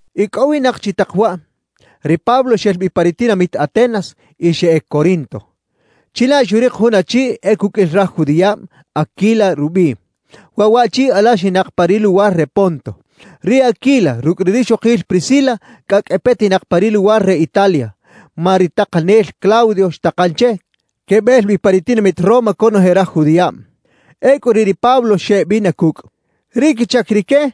Icꞌowinak chi tak waꞌ, ri Pablo xel bi pa ri tinamit Atenas y xeꞌec Corinto. Chilaꞌ xurik jun achi e cuqꞌuil raj judiꞌab, Aquila rubiꞌ. Waꞌ waꞌchi alaxinak pa ri luwar re Ponto. Ri Aquila rucꞌ ri rixokil Priscila cꞌacꞌ e petinak pa ri luwar re Italia, ma ri takanel Claudio xtakan che quebel bi pa ri tinamit Roma conoje raj judiꞌab. Ecꞌu riꞌ ri Pablo xeꞌbina cucꞌ. Ri quichac rique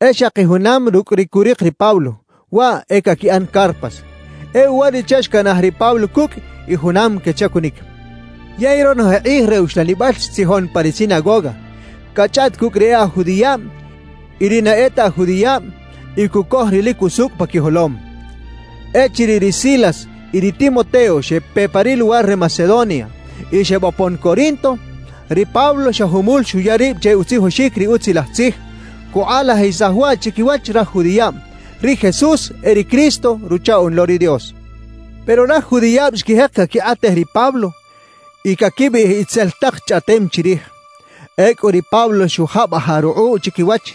e xaki junam rucꞌ ri curik ri Pablo, waꞌ e caquiꞌan carpas. E uwariꞌche xcanaj ri Pablo cucꞌ y junam quechacunic. Yey ronoje kꞌij re uxlanibal xtzijon pa ri sinagoga, cachꞌaꞌt cucꞌ ri e aj judiꞌab y ri na e ta aj judiꞌab y cucoj ri lic usucꞌ pa quijolom. Echiriꞌ ri Silas y ri Timoteo xepe pa ri luwar re Macedonia y xebopon Corinto, ri Pablo xa jumul xuya rib che utzijoxic ri Utzilaj Tzij, cukꞌalajisaj waꞌ chiquiwach raj judiꞌab: Ri Jesús e ri Cristo, Ruchaꞌoꞌn lo ri Dios. Pero raj judiꞌab xquijek caquikꞌatej ri Pablo y caquibiꞌij itzel tak chꞌaꞌtem chirij. Ecꞌu ri Pablo xujabajaꞌ rukꞌuꞌ chiquiwach,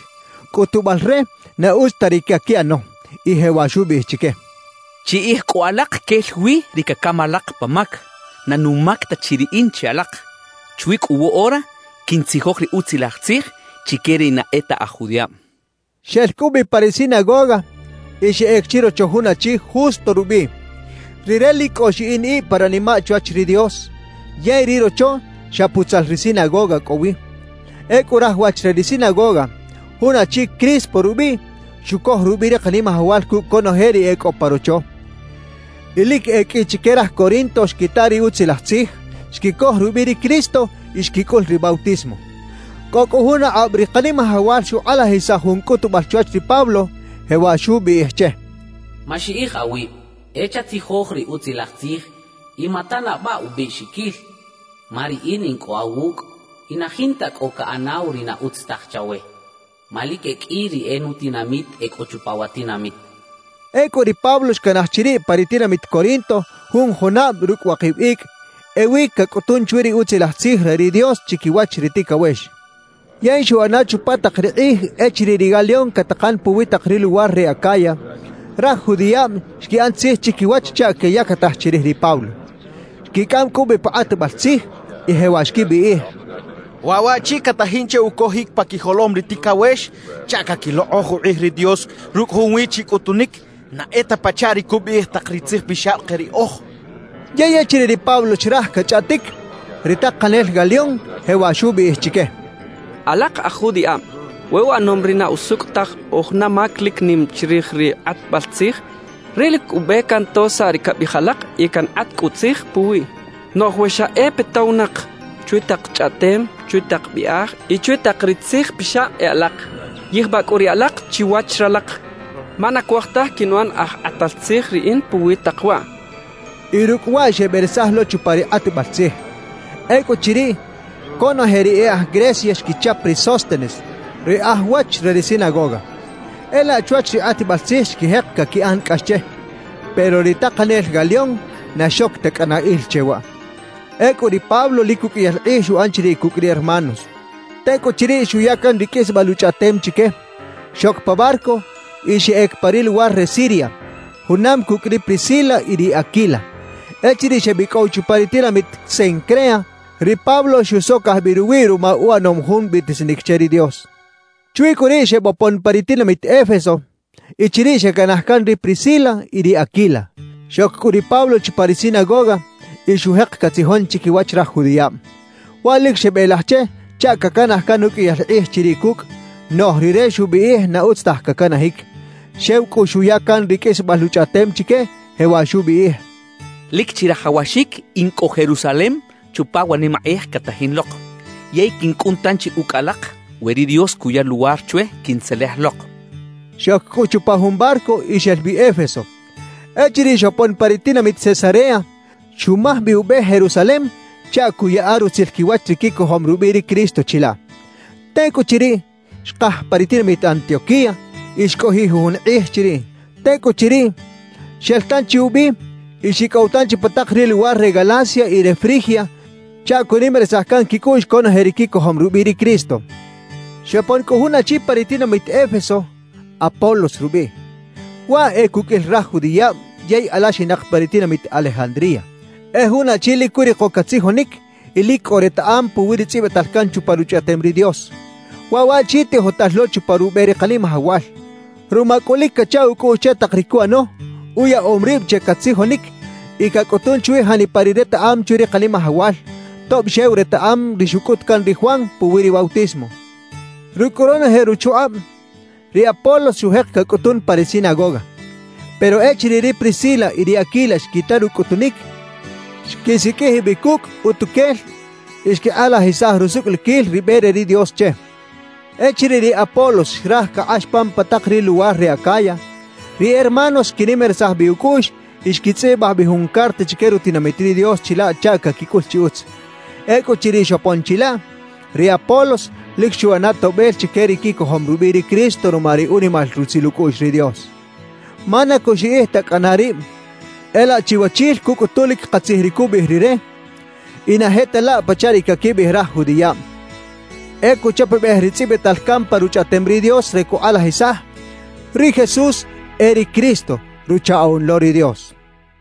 cꞌutubal re na utz ta ri caquiꞌano, y jewaꞌ xubiꞌij chique: «Chiꞌij cꞌu alak quel wi ri cacam alak pa mac; na numac ta chi riꞌin che alak. Chwi cꞌu woꞌora quiꞌntzijoj ri Utzilaj Tzij chique ri na e ta aj judiꞌab» xchaꞌ. Xel cꞌu bi pa ri sinagoga y xeꞌec chirocho jun achi Justo rubiꞌ. Rire lic cꞌo xiꞌin ib pa ranimaꞌ chwach ri Dios, yey ri rocho xa putzal ri sinagoga cꞌo wi. Ecꞌu raj wach re ri sinagoga, jun achi Crispo rubiꞌ, xucoj rubiꞌ ri Kanimajawal cucꞌ conoje ri e cꞌo pa rocho. Y lic e qꞌui chique raj Corinto xquita ri Utzilaj Tzij, xquicoj rubiꞌ ri Cristo y xquicꞌul ri bautismo. Cꞌo cꞌu jun akꞌab ri Kanimajawal xukꞌalajisaj jun cꞌutubal chwach ri Pablo, jewaꞌ xubiꞌij che: «Maxiꞌij awib; e chatzijoj ri Utzilaj Tzij y matanabaꞌ ubiꞌxiquil. Ma Riꞌin in cꞌo awucꞌ y na jinta cꞌo caꞌanaw ri na utz taj chawe; ma lic e qꞌui ri e nutinamit e cꞌo chupa wa tinamit» xchaꞌ. Ecꞌu ri Pablo xcanaj chiriꞌ pa ri tinamit Corinto jun junab rucꞌ wakib icꞌ; ewi cacꞌutun chwi ri Utzilaj Tzij re ri Dios chiquiwach ri ticawex. Yey xuꞌana chupa tak ri kꞌij echiriꞌ ri Galión catakan puwi tak ri luwar re Acaya, raj judiꞌab xquiꞌan tzij chiquiwach chaꞌ queyactaj chirij ri Pablo. Xquicꞌam cꞌu bi pa kꞌatbal tzij y jewaꞌ xquibiꞌij: —Waꞌ waꞌchi catajin che ucojic pa quijolom ri ticawex chaꞌ caquilokꞌoj ukꞌij ri Dios rucꞌ junwi chi cꞌutunic, na e ta pachaꞌ ri cubiꞌij tak ri tzijpixab ke riꞌoj —xechaꞌ. Yey echiriꞌ ri Pablo xraj cachꞌaꞌtic, ri takanel Galión jewaꞌ xubiꞌij chique: —Alak aj judiꞌab, we uꞌanom ri na usucꞌ taj o juna mac lic nim chirij ri kꞌatbal tzij, riꞌ lic ube canto saꞌ ri cabiꞌij alak y cankꞌat cꞌu tzij puwiꞌ. Noꞌj we xa e petowinak chwi tak chꞌaꞌtem, chwi tak biꞌaj y chwi tak ri tzijpixab e alak, yijbaꞌ cꞌu riꞌ alak chiwach ralak. Ma na cuaj taj quinuꞌan aj kꞌatal tzij riꞌin puwi tak waꞌ —xchaꞌ. Y rucꞌ waꞌ xeberesaj lo chupa ri kꞌatbal tzij. Ecꞌuchiriꞌ, conoje ri e aj Grecia xquichap ri Sóstenes, ri aj wach re ri sinagoga. E laꞌ chwach ri kꞌatbal tzij xquijek caquiꞌan cꞌax che; pero ri takanel Galión na xoc ta cꞌana il che waꞌ. Ecꞌu ri Pablo lic uqꞌuiyal kꞌij xuꞌan chiriꞌ cucꞌ ri hermanos. Tecꞌuchiriꞌ xuya can ri qꞌuisbal uchꞌaꞌtem chique, xoc pa barco y xeꞌec pa ri luwar re Siria, junam cucꞌ ri Priscila y ri Aquila. Echiriꞌ xebicꞌow chupa ri tinamit Cencrea, ri Pablo xusocaj bi ruwiꞌ ruma uꞌanom jun biꞌtisinic che ri Dios. Chwi cꞌu riꞌ xebopon pa ri tinamit Éfeso y chiriꞌ xecanaj can ri Priscila y ri Aquila. Xoc cꞌu ri Pablo chupa ri sinagoga y xujek catzijon chiquiwach raj judiꞌab. Waꞌ lic xebelaj che chaꞌ cacanaj can uqꞌuiyal kꞌij chiriꞌ cucꞌ; noꞌj rire xubiꞌij na utz taj cacanajic. Xew cꞌu xuya can ri qꞌuisbal uchꞌaꞌtem chique, jewaꞌ xubiꞌij: «Lic chirajawaxic in cꞌo Jerusalem chupa wa nimakꞌij catajin lok; yey quincꞌun tanchi ucꞌ alak we ri Dios cuya luwar chwe quintzelej lok» xchaꞌ. Xoc cꞌu chupa jun barco y xel bi Éfeso. Echiriꞌ xopon pa ri tinamit Cesarea, xumaj bi ube Jerusalem chaꞌ cuꞌyaꞌa rutzil quiwach ri quicojom rubiꞌ ri Cristo chilaꞌ. Tecꞌuchiriꞌ, xkaj pa ri tinamit Antioquía y xcꞌojiꞌ jujun kꞌij chiriꞌ. Tecꞌuchiriꞌ, xel tanchi ubi y xicꞌow tanchi pa tak ri luwar re Galacia y re Frigia chaꞌ cuꞌnimarisaj can quicꞌuꞌx conoje ri quicojom rubiꞌ ri Cristo. Xopon cꞌu jun achi pa ri tinamit Éfeso, Apolos rubiꞌ. Waꞌ e cuqꞌuil raj judiꞌab yey alaxinak pa ri tinamit Alejandría. E jun achi lic curiko catzijonic y lic cꞌo retaꞌam puwi ri tzꞌibital can chupa Ruchꞌaꞌtem ri Dios. Waꞌ waꞌchi tijotal lo chupa rube ri Kanimajawal. Ruma cꞌu lic cacha ucꞌuꞌx che tak ri cuꞌano, uyaꞌom rib che catzijonic y cacꞌutun chwi janipa ri retaꞌam chwi ri Kanimajawal, tob xew retaꞌam ri xucꞌut can ri Juan puwi ri bautismo. Rucꞌ cꞌu ronoje ruchukꞌab, ri Apolos xujek cacꞌutun pa ri sinagoga. Pero echiriꞌ ri Priscila y ri Aquila xquita rucꞌutunic, xquisiqꞌuij bi cucꞌ utuquel y xquikꞌalajisaj rusucꞌliquil ri be re ri Dios che. Echiriꞌ ri Apolos xraj cakꞌax pan pa tak ri luwar re Acaya, ri hermanos xquinimarisaj bi ucꞌuꞌx y xquitzꞌibaj bi jun carta chique rutinamit ri Dios chilaꞌ chaꞌ caquicꞌul chi utz. Ecꞌuchiriꞌ xopon chilaꞌ, ri Apolos lic xuꞌana toꞌbel chique ri quicojom rubiꞌ ri Cristo ruma ri unimal rutzil ucꞌuꞌx ri Dios. Ma na cuxiꞌij ta cꞌana rib, e laꞌ chiwachil cucꞌutu lic katzij ri cubiꞌij rire y na je ta laꞌ pachaꞌ ri caquibiꞌij raj judiꞌab. E cuchapabej ri tzꞌibital can pa Ruchꞌaꞌtem ri Dios re cukꞌalajisaj: Ri Jesús e ri Cristo, Ruchaꞌoꞌn lo ri Dios.